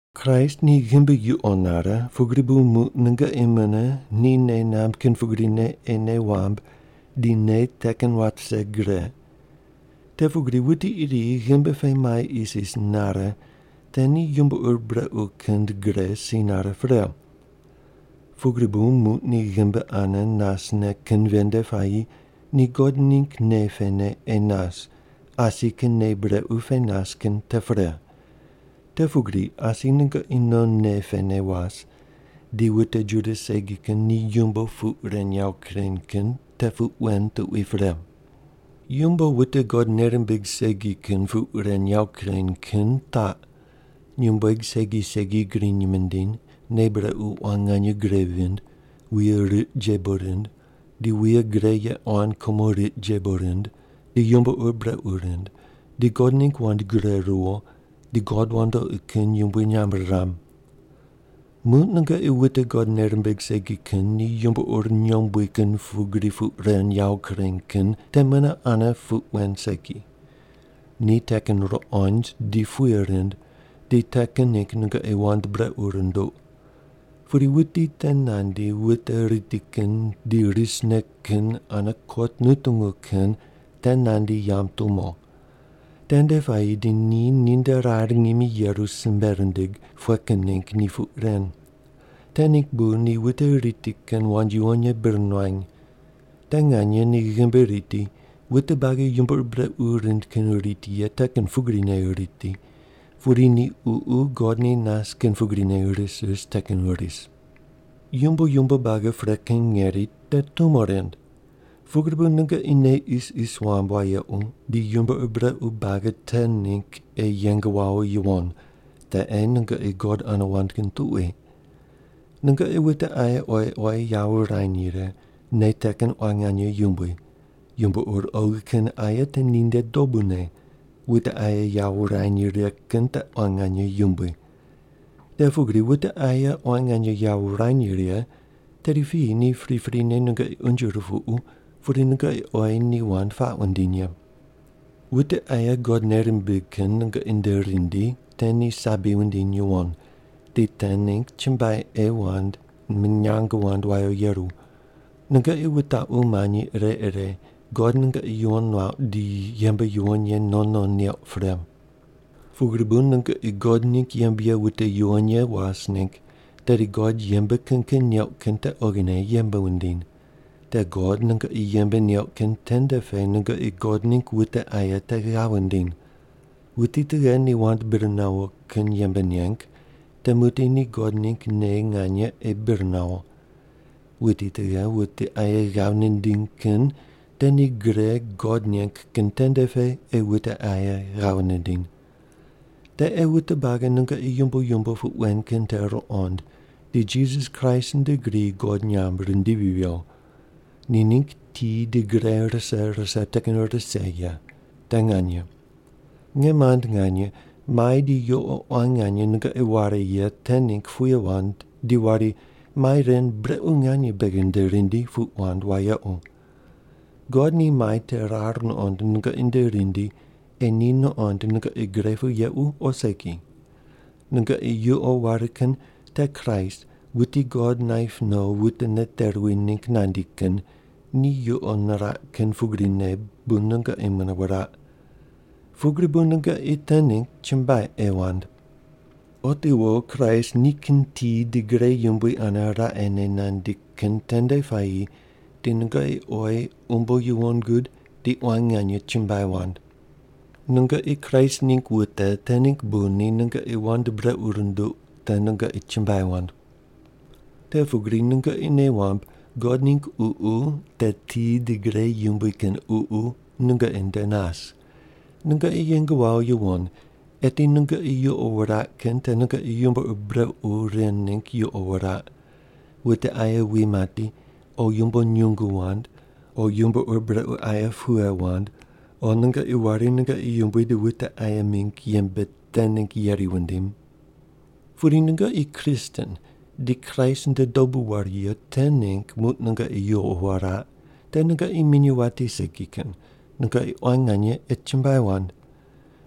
Kraist ni ghimbi yuqo nare, pugri bu muq nungoqi mune ni nei namb kin pugrine ei nei wamb di nei te kin wat vise gre. Te pugri wuti iri ghimbi pe mai isis nare te ni yumbo ur brequ kin gre si nare pre. Pugri bu muq ni ghimbi ane nasne kin ven nde puayi ni God ningg nei pene ei nas, asi kin nei brequ pe nas kin te pre. Te pugri asi nungoqi non nei pene was, di wute Juda segi kin ni yumbo puq ren yawo kureny kin te puq wen tuqui pre. Yumbo wute God nei rimbig segi kin puq ren yawo kureny kin taq: nyumbueg segi segi griny mindiny, nei brequ quan nganye gre vind, wuye riq jebo rind, di wuye gre ye quan kumo riq jebo rind di yumbo ur brequ rind, di God ningg wand gure ruwo, di god wandoqi kin yumbui nyamb riram. Muq nungoqi wute God nei rimbig segi kin ni yumbo ur nyombui kin pugri puq ren yawo kureny kin te mune ane puq wen segi. Ni te kin ruqond di puye rind, di te kin ningg nungoqi wand brequ runduq. Pudi wuti te nandi wute riti kin di risne kin ane kot nutungu kin te nandi yamb tumo. Tende puayi di ni ninde rar ngimi yeru simbe rindig, pughe kin ningg ni puq ren. Te ningg bu ni wute riti kin wand yuwon ye bir nuany. Te nganye ni ghimbi riti, wute buagi yumbo ur brequ rind kin riti ye te kin pugrine riti, pudi ni ququ God ni nas kin pugrine ris ris te kin ris. Yumbo yumbo buagi pre kin ngeri te tumo rind. Pugri bu nungoqi nei isis wamb wayequ di yumbo ur brequ buagi te ningg ei yeng wawo yuwon, te ei nungoqi God ane wand kin tuqui. Nungoqi wute aye oyi oyi yawo wurany righe, nei te kin quan nganye yumbui. Yumbo ur oghi kin aye te ninde dobune, wute aye yawo wurany righe kin te quan nganye yumbui. Te pugri wute aye quan nganye yawo wurany righe, tedi piyi ni priprine nungoqi unje rupuqu pudi nungoqi oyi ni wand puaq wundiny ye. Wute aye God nei rimbig kin nungoqi nde rindi te ni sabi wundiny yuwon. Di te ningg chumbuai ei wand, minyang wand wawo yeru. Nungoqi wutaqu manyi ire ire God nungoqi yuwon nuauq di yembe yuwon ye non non neuq pre. Pugri bu nungoqi God ningg yembe ye wute yuwon ye was ningg, tedi God yembe kin kin neuq kin te oghine yembe wundiny. Te God nungoqi yembe neuq kin tende pe nungoqi God ningg wute aye te ghav wundiny. Wuti tughe ni wand bir nawo kin yembe neng, te muqdi ni God ningg nei nganye ei bir nawo. Wuti tughe wute aye ghav nindiny kin te ni gre God neng kin tende pe ei wute aye ghav nindiny. Te ei wute buagi nungoqi yumbo yumbo puq wen kin te ruqond di Jisas Kraist nde gri God nyamb rindivi viyo. Ni ningg ti di gre rise rise te kin rise ye. Te nganye. Nge mand nganye, mai di yuqo quan nganye nungoqi ware ye te ningg puye wand di wari, “mai ren brequ nganye beghi nde rindi” puq wand wayequ. God ni mai te rar nuqond nungoqi nde rindi ei ni nuqond nungoqi gre pu yequ o segi. Nungoqi yuqo ware kin te Kraist, wuti God naip no wute nate ruwi ningg nandi kin, ni yuqo niraq kin pugrine bu nungoqi mune wuraq. Pugri bu nungoqi te ningg chumbuai ei wand. Otiwo Kraist nikin ti di gre yumbui ane raqene nandi kin tende puayi di nungoqi oyi umbo yuwon gud di quan nganye chumbuai wand. Nungoqi Kraist ningg wute te ningg bu ni nungoqi wand brequ runduq te nungoqi chumbuai wand. Te pugri nungoqi nei wamb God ningg Ququ, te ti di gre yumbui kin Ququ, nungoqi nde nas. Nungoqi yeng wawo yuwon, eti nungoqi yuqo wuraq kin te nungoqi yumbo ur brequ ren ningg yuqo wuraq: wute aye wi mati, o yumbo nyungu wand, o yumbo ur brequ aye pughe wand, o nungoqi wari nungoqi yumbui di wute aye mingg yembe te ningg yeri wundim. Pudi nungoqi Kristen di Kraist nde dobu waru ye te ningg muq nungoqi yuqo wuraq te nungoqi minyuw wati segi kin, nungoqi quan nganye ei chumbuai wand.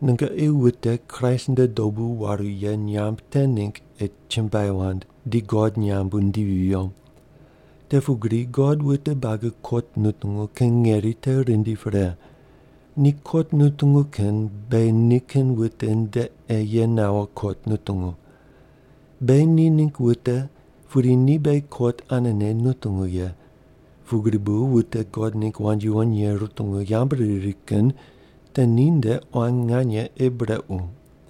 Nungoqi wute Kraist nde dobu waru ye nyamb te ningg ei chumbuai wand di God nyamb wundivi viyo. Te pugri God wute buagi kot nutungu kin ngeri te rindi pre. Ni kot nutungu kin beghi nikin wute nde ei ye nawo kot nutungu. Beghi ni ningg wute pudi ni beghi kot anene nutungu ye, pugri bu wute God ningg wand yuwon ye rutungu yambu riri kin te ninde quan nganye ei brequ.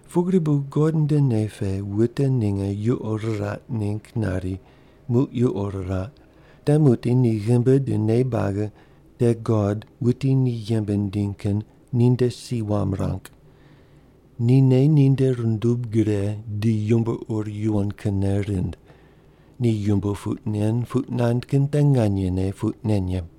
Pugri bu God nde nei pe wute ninge yuqo riraq ningg nari muq yuqo riraq, te muqdi ni ghimbi di nei buagi te God wuti ni yembe nindiny kin ninde si wam ruang. Ni nei ninde rundub gre di yumbo ur yuwon kinne rind. Ni yumbo puq nen puq nand kin te nganyene puq nen ye.